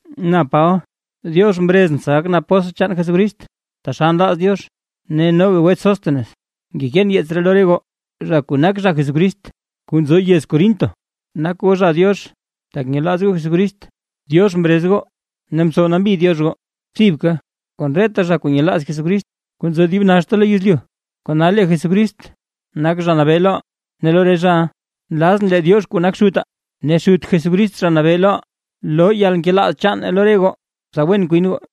Na Paba, Diox mrezʼn tsa gakʼn apóstl chaan Jesucrist, taxal nlaaz Diox. Ne noga wets Sóstenes, ngekeen yeets ree lo re goo, zha kuu nak zha Jesucrist kuu nzo yez Corinto, nak goo zha Diox tak nyelaaz goo Jesucrist. Diox mrez goo ne mtsow nambi Diox goo, thibka kon reta zha kuu nyelaaz Jesucrist kuu nzo dib naxta lo yezlyu. Kona lee Jesucrist nak Zha Nabee loʼaa ne lo re zhaʼa. Nlazʼn lee Diox kuu nak Xutaa, ne Xut Jesucrist Zha Nabee loʼaa, loo yalnkelaaz chaan lo re goo, tsa wen kwin goo.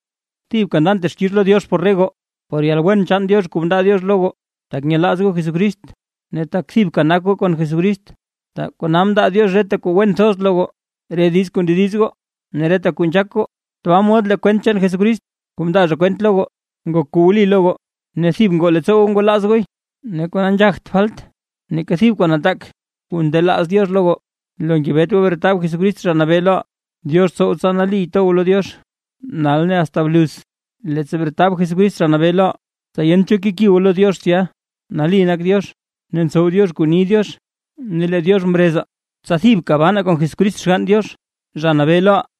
Thibka ndan texkix lo Diox por re goo, por yalwen chaan Diox kuu mndaa Diox lo goo, tak nyelaaz goo Jesucrist. Ne tak thibka nak goo kon Jesucrist, kona mndaa Diox reta kuu wen thoz lo goo, re diiz kuu ndediz goo ne reta kuu nzhaak goo. Tbaa mod lee kwent chaan Jesucrist kuu mndaa zha kwent lo goo ngok kuu wli lo goo; ne thib ngoo leettsoo goo ngwalaaz gooy. Ne kona nzhagt falt neeka thib kuu nataak kuu ndelaaz Diox lo goo, lo ngebet goo bretab Jesucrist Zha Nabee loʼaa. Diox tsow tsa nali to goo lo Diox nal ne asta bluz, leettsa bretab Jesucrist Zha Nabee loʼaa, tsa yent cho keki goo lo Diox tsya. Nali nak Diox ne ntsow Diox kuu ni Diox ne lee Diox mrezaa, tsa thibka banaa kon Jesucrist Xgann Diox, Zha Nabee loʼaa.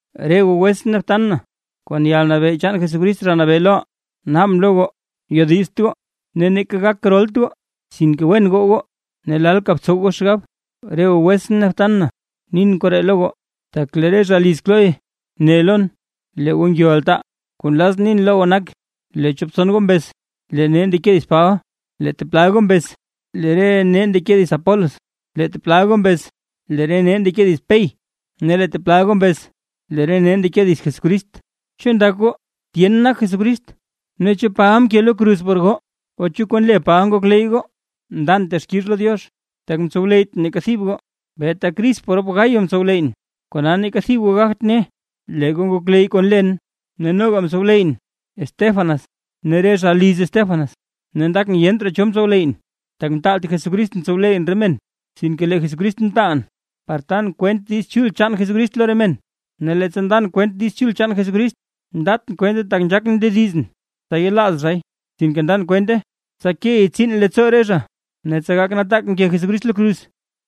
Re goo wetsʼn ne btan na, kon yalnabee chaan Jesucrist Zha Nabee loʼaa, naabʼn lo goo yodizt goo ne neeka gak rolt goo. Sinke wen goo goo ne lalka btsow goo xgab. Re goo wetsʼn ne btan na, nin koree lo goo, tak lee re zha liz Cloé ne lon, lee goo ngyo altaa. Kuu nlazʼn nin lo goo nak, lee chop tson goo mbez: “Lee nee ndeke dits Paba”. Lee teplal goo mbez: “Lee re nee ndeke dits Apolos”. Lee teplal goo mbez: “Lee re nee ndeke dits Pey”. Ne lee teplal goo mbez: “Lee re nee ndeke dits Jesucrist”. ¿Chu ndak goo tyen nak Jesucrist? ¿Ne chu Paba mke lo kruz por goo? ¿O chu kon le Paba ngokleyy goo? ¡Ndan texkix lo Diox, tak mtsowleyytʼn neeka thib goo, beeta Crispo rop Gayo mtsowleyyʼn! Kona neeka thib goo gagt ne, lee goo ngokleyy goo kon len. Ne noga mtsowleyyʼn Estéfanas ne re zha liz Estéfanas, ne ndakʼn yent raa cho mtsowleyyʼn. Tak mtaalt Jesucristʼn tsowleyyʼn re men, sinke lee Jesucrist mtaal, par tan kwent Diiz Chul chaan Jesucrist lo re men. Ne leettsa ndan kwent Diiz Chul chaan Jesucrist, ndatʼn kwente tak nzhaakʼn ndedizʼn tsa yelaaz zhay. Sinke ndan kwente tsa key tsiin leettsoo zha ne tsa gak nataak mke Jesucrist lo kruz.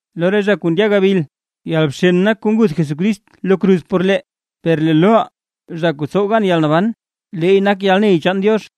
Lo re zha kuu ndya gabil, yalbxen nak kuu nguth Jesucrist lo kruz por lee, per lee loʼaa zha kuu tsow gan yalnaban, leey nak yalney chaan Diox.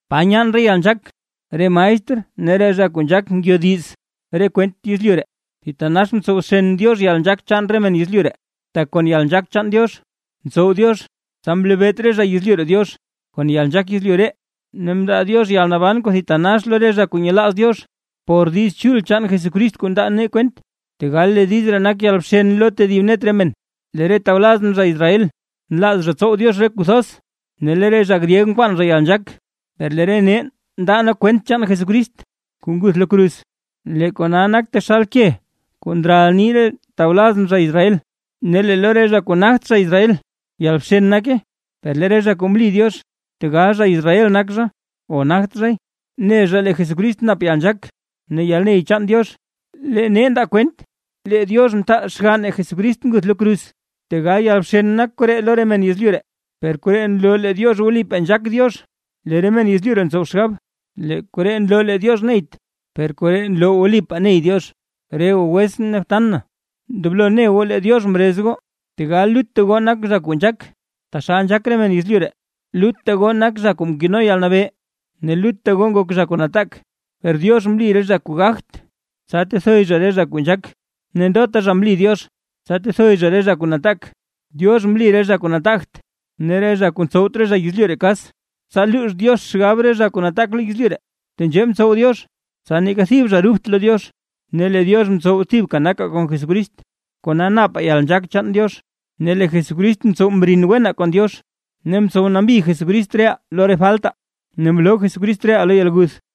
¿Pa nyaan re zha nzhaak, re maestr ne re zha kuu nzhaak ngyodiz re kwent yezlyu ree? ¡Thitanax mtsow bxen Diox yalnzhaak chaan re men yezlyu ree! Tak kon yalnzhaak chaan Diox, mtsow Diox tsa mlebeet re zha yezlyu ree Diox kon yalnzhaak yezlyu ree. Ne mndaa Diox yalnaban kuu thitanax lo re zha kuu nyelaaz Diox, por Diiz Chul chaan Jesucrist kuu ndaa nee kwent, tegal lee diiz ree nak yalbxen lo tedib net re men. Lee re tawlazʼn zha Israel nlaaz zha tsow Diox re kuu thoz, ne lee re zha gryeg nkwaan zha yalnzhaak, per lee nee ndaa nee kwent chaan Jesucrist kuu nguth lo kruz. Lee kona nak taxal ke kuu ndral nii re tawlazʼn zha Israel, ne lee lo re zha kuu nagt zha Israel yalbxen nake, per lee re zha kuu mli Diox, tegal zha Israel nak zha o nagt zhay ne zha lee Jesucrist nap yalnzhaak ne yalney chaan Diox. Lee nee ndaa kwent, lee Diox mtaal xganne Jesucrist nguth lo kruz, tegal yalbxen nak koree lo re men yezlyu ree, per koree nloo lee Diox wlipaa nzhaak Diox; lee re men yezlyu ree ntsow xgab, lee koree nloo lee Diox neyt, per koree nloo wlipaa ney Diox. Re goo wetsʼn ne btan na, ndoblo ne goo lee Diox mrez goo, tegal lutta goo nak zha kuu nzhaak taxal nzhaak re men yezlyu ree, lutta goo nak zha kuu mkeno yalnabee ne lutta goo ngok zha kuu nataak. Per Diox mli re zha kuu gagt, tsa tethoy zha re zha kuu nzhaak, ne ndota zha mli Diox, tsa tethoy zha re zha kuu nataak. Diox mli re zha kuu nataagt ne re zha kuu ntsowt re zha yezlyu ree kas, tsa luux Diox xgab re zha kuu nataak lo yezlyu ree. Tenzhee mtsow Diox, tsa neeka thib zha rubt lo Diox. Ne lee Diox mtsow thibka nakaa kon Jesucrist, kona napaa yalnzhaak chaan Diox, ne lee Jesucrist mtsow mrin wenaa kon Diox ne mtsow nambi Jesucrist reʼaa lo re faltaa. Ne mloo Jesucrist reʼaa lo yalguth.